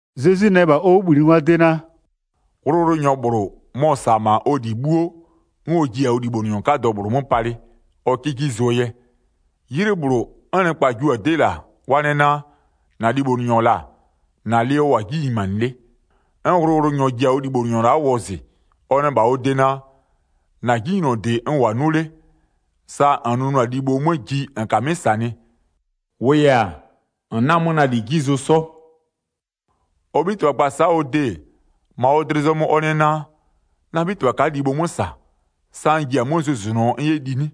Zezwi nɛ -bha ɔ 'wʋbhlinɩngwaa de naa: “Wʋlʋwʋlʋnyɔ -bhlʋ, mɔ-ɔ -sa-a -ma ɔ lɩ 'bhuo 'n ɔ jiɩ-a ɔ libhonʋnyɔ 'kadɔ -bhlʋ 'mö palɩ, ɔ 'kɩ 'ji zʋɔ yɛ. 'Ylɩ -bhlʋ, 'n nɩkpa jio-a 'dɩ -la, wa nɛ naa: -Na libhonʋnyɔ -la, -na lɩ ɔ -wʋ-a 'ji nyimanɩ 'le. 'N wʋlʋwʋlʋnyɔ ji-a ɔ libhonʋnyɔ la'a wɔzɩ, ɔ nɛ -bha ɔ de naa: -Na 'jinylɔdɩ n -wʋ-a 'nʋ 'le, sa -n nʋnʋ-a libho 'mö ji -n -kamɩ'ɩ -sanɩ. -Wʋʋ yɛ-a, -n 'na-a 'mö na -li 'ji zʋ 'sɔ. Ɔ 'bhitɩbha gba-a sa'a ɔ de-e, -ma ɔ dlɩ zɔmö ɔ nɛ naa: Na 'bhitɩbha ka'a libho 'mö -sa, sa n ji-a 'mö zʋzʋnʋɔ n 'yɛ li 'nɩ?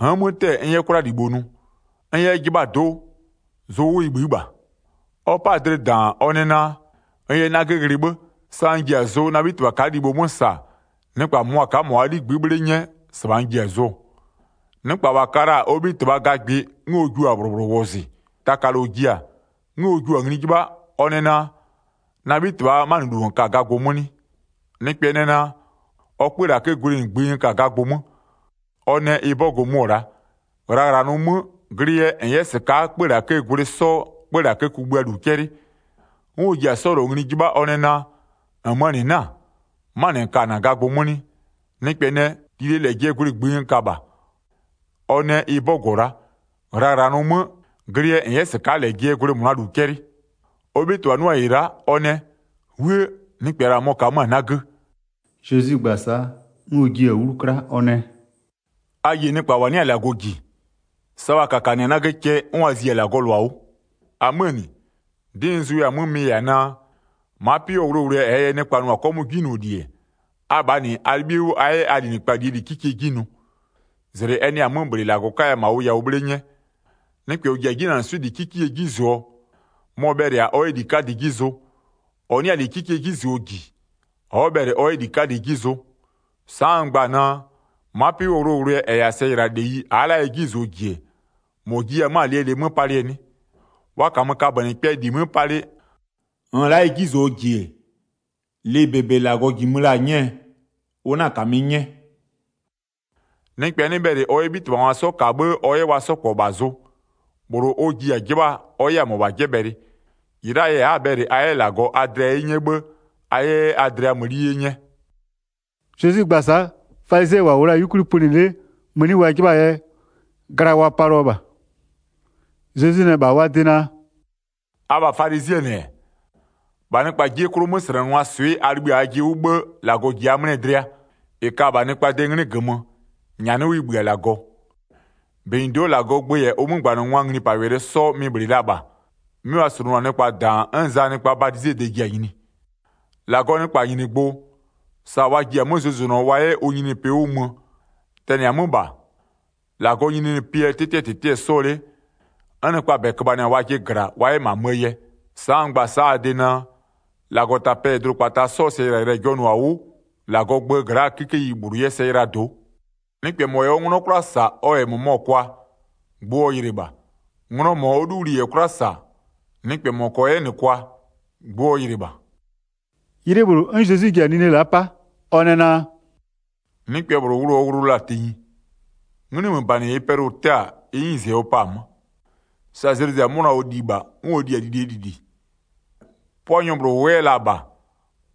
N'n 'mö 'tɛ-ɛ 'bhë n 'yɛ 'kwlalibho nʋ. N 'yɛ 'yɛ 'jɩbhaa do'o, zʋ 'wʋ ɩ bhï'ï -bha. Ɔ 'pa-a dlɩ -daan, ɔ nɛ naa: N yɛ 'nagö ghlɩ 'bhë, sa n 'yɛ-a zʋ na 'bhitɩbha ka'a libho 'mö -sa, nɩkpa -mʋmʋa ka'a -ma wa 'ligbï'ï 'bhle 'nyɛ, -sɩbha n ji-a zʋɔ. Nɩkpa -wa ka la-a ɔ 'bhitɩbhaa gagbɩ 'n ɔ jua-a -bhlʋ -bhlʋ wɔzɩ. Taka -lɔ ji-a, 'n ɔ jio-a ngli 'jɩbha, ɔ nɛ naa: Na 'bhitɩbhaa 'manɩlu -n ka-a gagbʋ 'mö 'nɩ? Nɩkpɛ nɛ naa: Ɔ 'kpölakëë gwlɩ -ngbï n ka-a gagbʋ 'mö. Ɔ nɛ: Ɩ 'bɔgʋ mʋ-ɔ la'a, ghlaghlanʋʋ 'mö, glɩ yɛ -n 'yɛ -sɩka'a 'kpölakëë gwlɩ 'sɔ 'kpölakë kugbïaa -lu 'cɛlɩ. 'N ɔ ji-a 'sɔ -lɔ ngli 'jɩbha ɔ nɛ naa: -Nmöö -nɩ 'na-a? Ɔ 'manɩ -n ka-a -na gagbʋ 'mö 'nɩ? Nɩkpɛ nɛ: Lilie -lɛjɩɛ gwlɩ -ngbï -bha. Ɔ nɛ: Ɩ 'bɔgʋ-ɔ la'a, ghlaghlanʋʋ 'mö, glɩ yɛ -n 'yɛ -sɩka'a -lɛjɩɛ gwlɩ -mʋnaa -lu 'cɛlɩ. Ɔ 'bhitɩbha 'nʋ-a -ɩ la'a, ɔ nɛ: 'Wuë! Nɩkpɛ -la mɔ-ɔ ka-a 'mö-a 'nagö.” Zezwi gba-a sa'a, 'n ɔ jiɩ-a 'wlu 'kla, ɔ nɛ: “A yie nɩkpa -wa 'nɩ-a -Lagɔ -ji, sa wa -kakanɩ-a 'nagö cɛ 'n wa zi-a -Lagɔɔ -lʋa 'wʋ. 9-Amöö -nɩ, 'dɩ n zʋya-a 'mö mɩ-ɩ yɛ-a naa: Ma'a 'pɩ 'wʋɔ wʋlʋwʋlʋɛ -ɛɛ yɛ nɩkpa nʋ-a 'kɔmʋʋ 'jinyloli-e, abhaa -nɩ a 'libhie 'wʋ a 'yɛ a linɩkpa -lie -li 'kikie 'ji nʋ, -zlɩ ɛ 'nɩ-a 'mö -bhlɩ -Lagɔ 'kaya -ma ʋ yawʋ 'bhle 'nyɛ. Nɩkpɛ -ɔ -ji-a 'jinanɩswɩ'ɩ -li 'kikiee 'ji -zʋɔ, mɔ-ɔ bhɛlɩ-a ɔ 'yɛ -li 'kadɩ 'ji zʋ. -Ɔ 'nɩ-a -li 'kikiee 'ji -zʋɔ -ji, ɔ'ɔ bhɛlɩ ɔ 'yɛ -li 'kadɩ 'ji zʋ. Sa'a n gba-a naa: Ma'a 'pɩ 'wʋɔ wʋlʋwʋlʋɛ -ɛ -yɛ-a sɛyɩlaleyi a'a la'a ɛ 'ji -zʋɔ -ji-e, -mɔ jiya 'mö-a lɩɛ lɩ 'mö palɩɛ 'nɩ? Wa -kamö kabönɩkpɛɛ -li 'mö palɩ, -nn la'a ɩ 'ji -zʋɔ -ji-e, lɩ -bebe -Lagɔ -jimö la-a nyɛɛ, ʋ 'na -kamɩ 'nyɛ. Nɩkpɛ 'nɩ bhɛlɩ ɔ 'yɛ 'bhitɩbhangwa 'sɔ -ka 'bhë ɔ 'yɛ wa 'sɔ -kpɔ -bha -zʋ. -Bhlʋ ɔ ji-a 'jɩbhaa ɔ 'yɛ-a -mɔbha 'jɛbhɛlɩ. -Ɩ la'aa yɛ a'a-a bhɛlɩ a 'yɛ -Lagɔ a dlɩa 'ye 'nyɛ 'bhë a 'yɛ 'yɛ a dlɩa mëni 'ye 'nyɛ.” Zezwi gba-a sa'a, falizɩɛ -wa -wʋ la-a 'yukwli pönɩ 'le mëni wa 'jɩbha-aa yɛ, gla wa palɩɔ -bha. Zezwi nɛ -bha wa de naa: “Abha falizɩɛ -nɩ-ɛ, -bha nɩkpaa 'jie 'klʋ 'möslɛnɩngwaa swɩ'ɩ a libhï-a ajɩ 'wʋ 'bhë, -Lagɔ -ji a 'mlɩɛ dlɩa. -Ɩ ka-a -bha nɩkpaa de 'nglɩ -gömö, -nyanɩ 'wʋ ɩ -bhï-a -Lagɔ. 16-Benyido'oo -Lagɔɔ gbö -yɛ ʋ 'mögbanɩngwaa nglipawɛlɩ 'sɔ mɩ-ɩ -bhlɩ la -bha, 'mɩ wa slʋnʋ-a nɩkpa -daan 'n Zaa nɩkpaa badizee de ji-a nyini. -Lagɔɔ nɩkpanyinigbʋ, sa wa ji-a 'mö zʋzʋnʋɔ wa 'yɛ ʋ nyininyinipɩ 'wʋ mö, tɛnɩ-a 'mö -bha, -Lagɔɔ nyininyinipɩɛ 'tɩtɩɛ -tɩtɩ-ɛ 'sɔɔ 'le, 'n nɩkpaa -bɛ köbhanɩ-a wajɩ -gla wa 'yɛ -ma 'möö yɛ. Sa'a n gba-a sa'a a de naa, -Lagɔtapɛ -yɛ dʋdʋkpata 'sɔɔ sɛyɩlayɩlɩɛ jɔnʋ-a 'wʋ -Lagɔɔ gböö gla'a 'kikeyi -bhlʋ 'yɛ sɛ yɩlaa do'o. Nɩkpɛ -mɔ -yɛ ɔ 'nglɔ 'kwla -sa ɔ -yɛ nglɔ -mʋmɔ kwa, gbʋ ɔ yɩlɩ -bha. Nglɔ -mɔ ɔ 'luwli -yɛ 'kwla -sa, nɩkpɛ -mɔ -kɔɔ 'yɛ -nɩ kwa, gbʋ ɔ yɩlɩ -bha.” 'Ylɩ -bhlʋ, 'n Zezwi ji-a nine la'a 'pa, ɔ nɛ naa: “Nɩkpɛ -bhlʋ wʋlʋ ɔ wʋlʋ la-a tenyi. 'Nglɩmöbanɩ -ɩɩ pɛlʋ-ʋ 'tɛɛ-a ɩ 'nyize ɔ pa-a 'mö. Sa zlɩ zɩ-a 'mʋna ɔ li -bha 'n ɔ li-a lilie lili. 'Pʋanyɔ -bhlʋ -wʋ 'yɛ la-a -bha,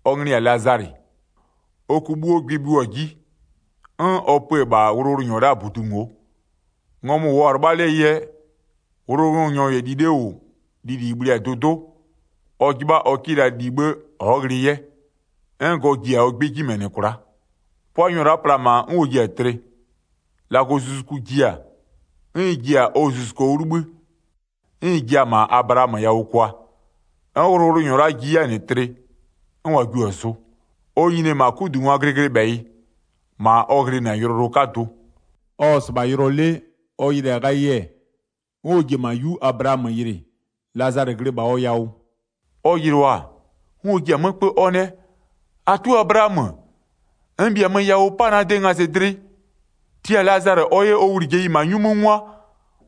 ɔ nglɩ-ɩ -yɛ-a Lazalɩ, ɔ ku 'bhuo gbɩ-ɩ bhɩʋ-a 'ji, 'n ɔ pö-ö -bha wʋlʋwʋlʋnyɔ la'aa -budu ngo'o. Ngɔmʋ-ʋ -wʋɔ-a 'lɩbha 'lee yɛ, wʋlʋwʋlʋnyɔ -yɛ li 'le -wʋ, lili -ɩ bhli-a dʋdʋ'ʋ, ɔ 'jɩbha ɔ 'kɩ la li 'bhë ɔ'ɔ ghlɩɩ 'yɛ. 'N gɔ ji-a ɔ 'gbɩ 'ji -mɛnɩ kwla'a. 'Pʋanyɔ la'a pla-a -ma 'n ɔ ji-a tlɩ. -Lagɔzuzuku ji-a, 'n ɩ ji-a ɔ zuzuko 'wʋ 'libhï, 'n ɩ jia-a -ma Ablaamö yawʋ kwa. 'N wʋlʋwʋlʋnyɔ la'a ji 'yɛ-a -nɩ tlɩ, 'n wa jio-a zʋ. Ɔ nyini-e -ma 'kudungwaa glɩglɩbhɛyɩ, -ma ɔ ghlɩnɩ-a yʋlɔyʋlʋ 'kadʋ. Ɔ-ɔ -sɩbha yʋlɔ 'le, ɔ yɩlɩ-a ghayɩ-ɛ, 'n ɔ ji-e -ma 'yu Ablaamö yɩlɩ, Lazalɩ glɩ -bha ɔ yawʋ. Ɔ yɩlɩɔ-a, 'n ɔ ji-a 'mö 'kpö, ɔ nɛ: -Atʋ Ablaamö, n -bhiamö yawʋ 'pa na de ngazɩdlɩ! Tia Lazalɩ ɔ 'yɛ ɔ wlijeyi -ma 'nyu 'mö 'ngwa,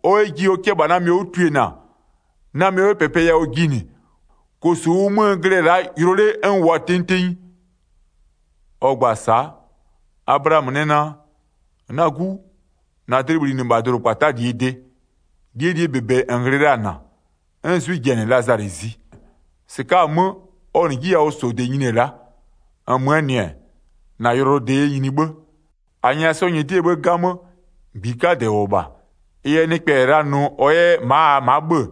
ɔ 'yɛ ji ɔ 'kʋ -bha na mɩɔ 'wʋ twiena, na mɩɔ 'yɛ -pɛpɛ yawʋ jinɩ, -kosu -ʋʋ 'mö n glɩ-ɛ la'a yʋlɔ 'le n -wʋ-a tenyi tenyi. Ɔ gba-a sa'a, Ablaamö nɛ naa: Na 'gu, -na dlɩ bhlinɩ -bha dʋdʋkpata'aa -lie de. -Lie -li -bebe -n ghlɩ la-a -na, 'n 'zwɩ ji-a -nɩ Lazalɩ zi. -Sɩka'a-a 'mö, ɔ -nɩ 'jiyawʋsɔde nyini-e la'a, -nmöö -nɩ-ɛ, -na yʋlɔyʋlɔde yɛ nyini 'bhë. 26-A nyɛya 'sɔɔ nyɩdɩɛ 'bhë 'gamö, -gbi 'kadɛ -wʋ-ɔ -bha. Ɩ yɛ nɩkpɛ -yɛ la nʋ ɔ 'yɛ ma'a -aa ma'a 'bhö-ö,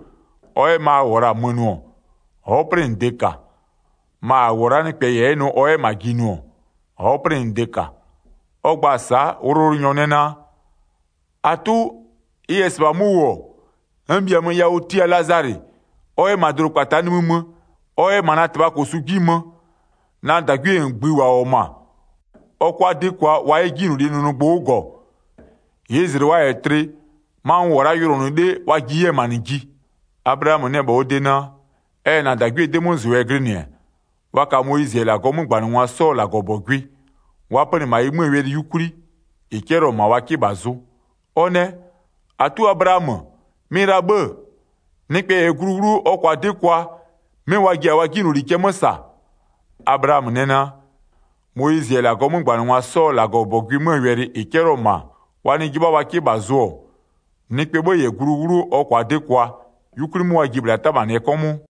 ɔ 'yɛ ma a -wʋ-ɔ -la mö nʋ-ɔ, ɔ'ɔ 'plɩnɩde -ka. Ma -a -wʋ-ɔ la'a nɩkpɛ -yɛ 'yɛ nʋ ɔ 'yɛ -ma ji nʋ-ɔ, ɔ'ɔ 'plɩnɩde -ka. Ɔ gba-a sa'a, wʋlʋwʋlʋnyɔ nɛ naa: -Atʋ, ɩ -yɛ -sɩbha 'mö -wʋ-ɔ, n -bhiamö yawʋ, tia Lazalɩ ɔ 'yɛ -ma dʋdʋkpata'a nimï mö, ɔ 'yɛ -ma na -tɩbhaa -kosu 'ji mö, na -dagwie -ngbï -wa -wʋ-ɔ -ma, ɔ 'kʋa 'dɩ kwa wa 'yɛ 'jinylolie nʋnʋgbʋ 'wʋ -gɔ, -ɩɩ -zlɩ wa -yɛ tlɩ, ma n -wʋ-ɔ la'a yʋlɔnʋ 'le, wa ji-e 'yɛ -ma -nɩ ji. Ablaamö nɛ -bha ɔ de naa: Ɛ -yɛ -na -dagwiee 'dɩmözʋ yɛ glɩnɩ-ɛ, wa ka Moyizɩ -yɛ -Lagɔɔ 'mögbanɩngwa 'sɔɔ -Lagɔbɔgʋɩ, wa pönɩ -ma ɩ 'möö wɛlɩ 'yukwli, -ɩ 'cɛlɩɔ-ɔ -ma wa 'kɩ -bha zʋ. Ɔ nɛ: -Atʋ Ablaamö, mɩ-ɩ la-a 'bhë-ë, nɩkpɛ -yɛ glu 'wlʋ, ɔ -kʋa 'dɩ kwa, 'mɩ wa ji-a wa 'jinyloli cɛ 'mö -saa. Ablaamö nɛ naa: Moyizɩ -yɛ -Lagɔɔ 'mögbanɩgwa 'sɔɔ -Lagɔbɔgʋɩ 'möö wɛlɩ -ɩ 'cɛlɩɔ-ɔ -ma wa nɩ 'jɩbha wa 'kɩ -bha zʋ-ɔ, nɩkpɛɛ 'bhë -yɛ glu 'wlʋ ɔ -kʋa 'dɩ kwa, 'yukwli 'mö wa ji-e -bhla 'tamanɩɛ 'kɔmʋʋ.”